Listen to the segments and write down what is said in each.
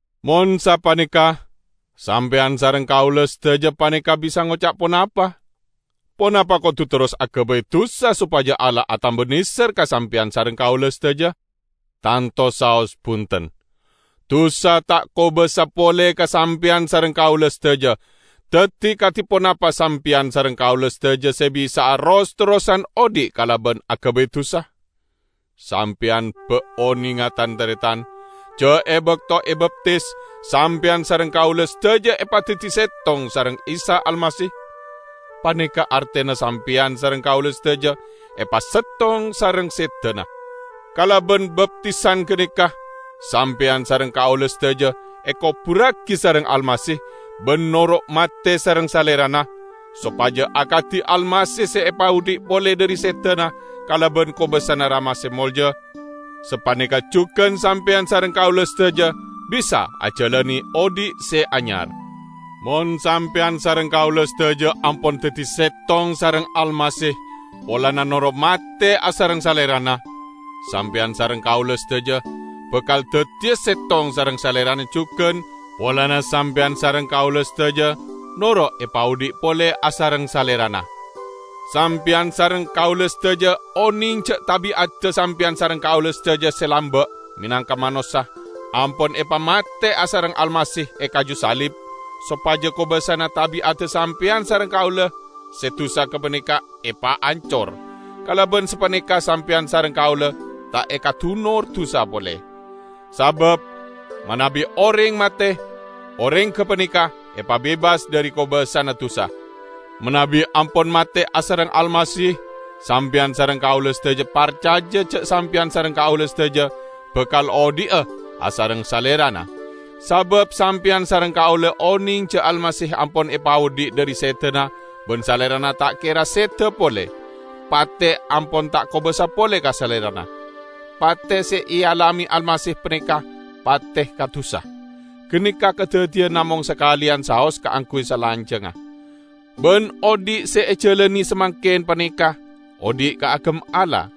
Mon sapaneka, sampeyan sareng kaula sadaja paneka bisa ngoca' ponapa? Ponapa kodu terros agabay dusa sopaja Allah atamba neser ka sampeyan sareng kaula sadaja? Tanto saos bunten. Dusa ta' kobasa pole ka sampeyan sareng kaula sadaja, daddi kadi ponapa sampeyan sareng kaula sadaja se bisa'a ros-terrosan odhi' kalaban agabay dusa? Sampeyan ba' onenga, tan-taretan, ja' e bakto ebaptis, sampeyan sareng kaula sadaja epadaddi settong sareng Isa Almasih? Paneka artena sampeyan sareng kaula sadaja epasettong sareng sedana. Kalaban baptisan ganeka, sampeyan sareng kaula sadaja ekoburragi sareng Almasih ban noro' mate sareng Salerana, sopaja akadi Almasih se epaodhi' pole dhari sedana kalaban kobasana Rama se molja, sapaneka jugan sampeyan sareng kaula sadaja bisa ajalane odhi' se anyar. Mon sampeyan sareng kaula sadaja ampon daddi settong sareng Almasih polana noro' mate asareng Salerana, sampeyan sareng kaula sadaja bakal daddiya settong sareng Salerana jugan polana sampeyan sareng kaula sadaja noro' epaodhi' pole asareng Salerana. Sampeyan sareng kaula sadaja oneng ja' tabi'adda sampeyan sareng kaula sadaja se lamba' menangka manossa ampon epamate asareng Almasih e kaju salib sopaja kobasana tabi'adda sampeyan sareng kaula se dusa gapaneka epaancor; kalaban sapaneka sampeyan sareng kaula ta' ekadunor dusa pole. Sabab manabi oreng mate, oreng gapaneka epabebas dhari kobasana dusa. Manabi ampon mate asareng Almasih, sampeyan sareng kaula sadaja parcaja ja' sampeyan sareng kaula sadaja bakal odhi'a asareng Salerana. Sabab sampeyan sareng kaula oneng ja' Almasih ampon epaodhi' dhari sedana ban Salerana ta' kera seda pole; pate ampon ta' kobasa pole ka Salerana. Pate se ealame Almasih paneka pate ka dusa. Ganeka kadaddiyan namong sakaleyan saos kaangguy salanjangnga. Ban odhi' se ejalane samangken paneka odhi' kaagem Allah.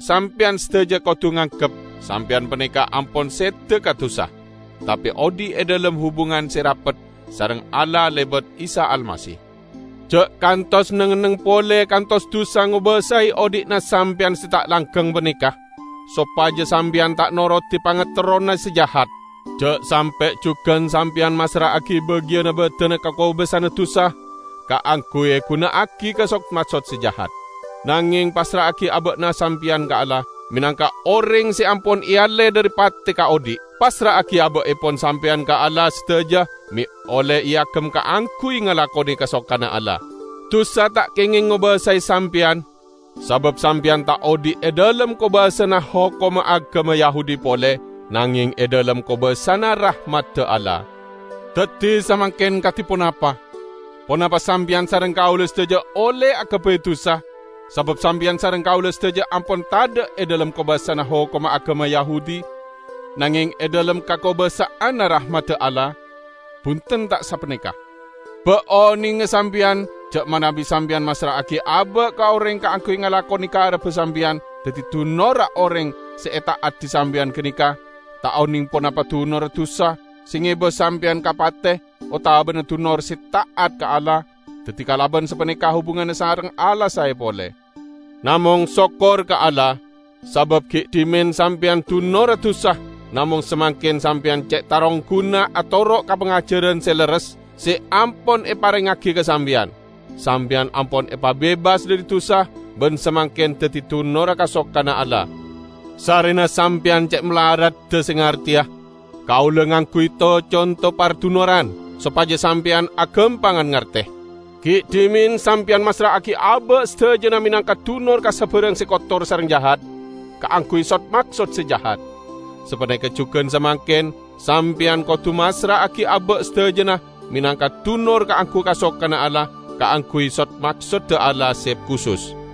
Sampeyan sadaja kodu nganggep sampeyan paneka ampon seda ka dusa, tape odhi' e dhalem hubungan se rapet sareng Allah lebat Isa Almasih. Ja' kantos neng-enneng pole kantos dusa ngobasae odhi'na sampeyan se ta' langgeng paneka sopaja sampeyan ta' norodi pangaterrona se jahat. Ja' sampe' jugan sampeyan massra'agi bagiyanna badanna ka kobasana dusa kaangguy eguna'agi ka sod-maksod se jahat. Nangeng passra'agi aba'na sampeyan ka Allah menangka oreng se ampon ealle dhari pate ka odhi'. Passra'agi aba'epon sampeyan ka Allah sadaja me' olle eagem kaangguy ngalakone kasokanna Allah. Dusa ta' kengeng ngobasae sampeyan, sabab sampeyan ta' odhi' e dhalem kobasana hokomma agama Yahudi pole nangeng e dhalem kobasana rahmadda Allah. Daddi samangken kadi ponapa? Ponapa sampeyan sareng kaula sadaja olle agabay dusa, sabab sampeyan sareng kaula sadaja ampon tadha' e dhalem kobasana hokomma agama Yahudi nangeng e dhalem kakobasa'anna rahmadda Allah? Bunten ta' sapaneka! Ba' onenga sampeyan ja' manabi sampeyan massra'agi aba' ka oreng kaangguy ngalakone karebba sampeyan daddi dunorra oreng se eta'adi sampeyan ganeka -- ta' oneng ponapa dunorra dusa se ngeba sampeyan ka pate, otabana dunor se ta'at ka Allah, daddi kalaban sapaneka hubunganna sareng Allah sae pole. Namong sokkor ka Allah! Sabab gi' dhimen sampeyan dunorra dusa namong samangken sampeyan ce' tarongguna atoro' ka pangajaran se lerres se ampon eparengngagi ka sampeyan. Sampeyan ampon epabebas dhari dusa, ban samangken daddi dunorra kasokanna Allah. Sarrena sampeyan ce' malaradda se ngarteya, kaula ngangguy to-conto pardunoran sopaja sampeyan agampangan ngarte. Gi' dhimen sampeyan massra'agi aba' sadajana menangka dunor ka sabarang se kotor sareng jahat kaangguy sod-maksod se jahat. Sapaneka jugan samangken, sampeyan kodu massra'agi aba' sadajana menangka dunor kaangguy kasokanna Allah kaangguy sod-maksodda Allah se kusus.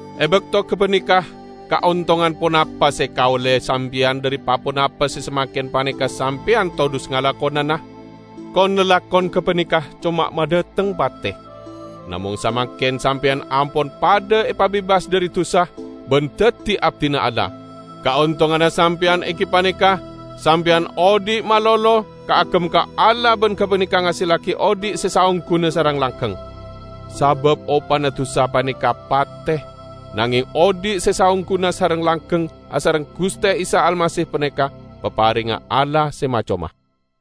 E bakto gapaneka, kaontongan ponapa se ekaolle sampeyan dhari pa-ponapa se samangken paneka sampeyan todhus ngalakonana? Kon-lalakon gapaneka coma madhateng pate! Namong samangken sampeyan ampon padha epabebas dhari dusa, ban daddi abdina Allah. Kaontonganna sampeyan enggi paneka sampeyan odhi' malolo kaagem ka Allah ban gapaneka ngasellagi odhi' se saongguna sareng langgeng. Sabab opana dusa paneka pate; nangeng odhi' se saongguna sareng langgeng asareng Guste Isa Almasih paneka paparengnga Allah se ma-coma.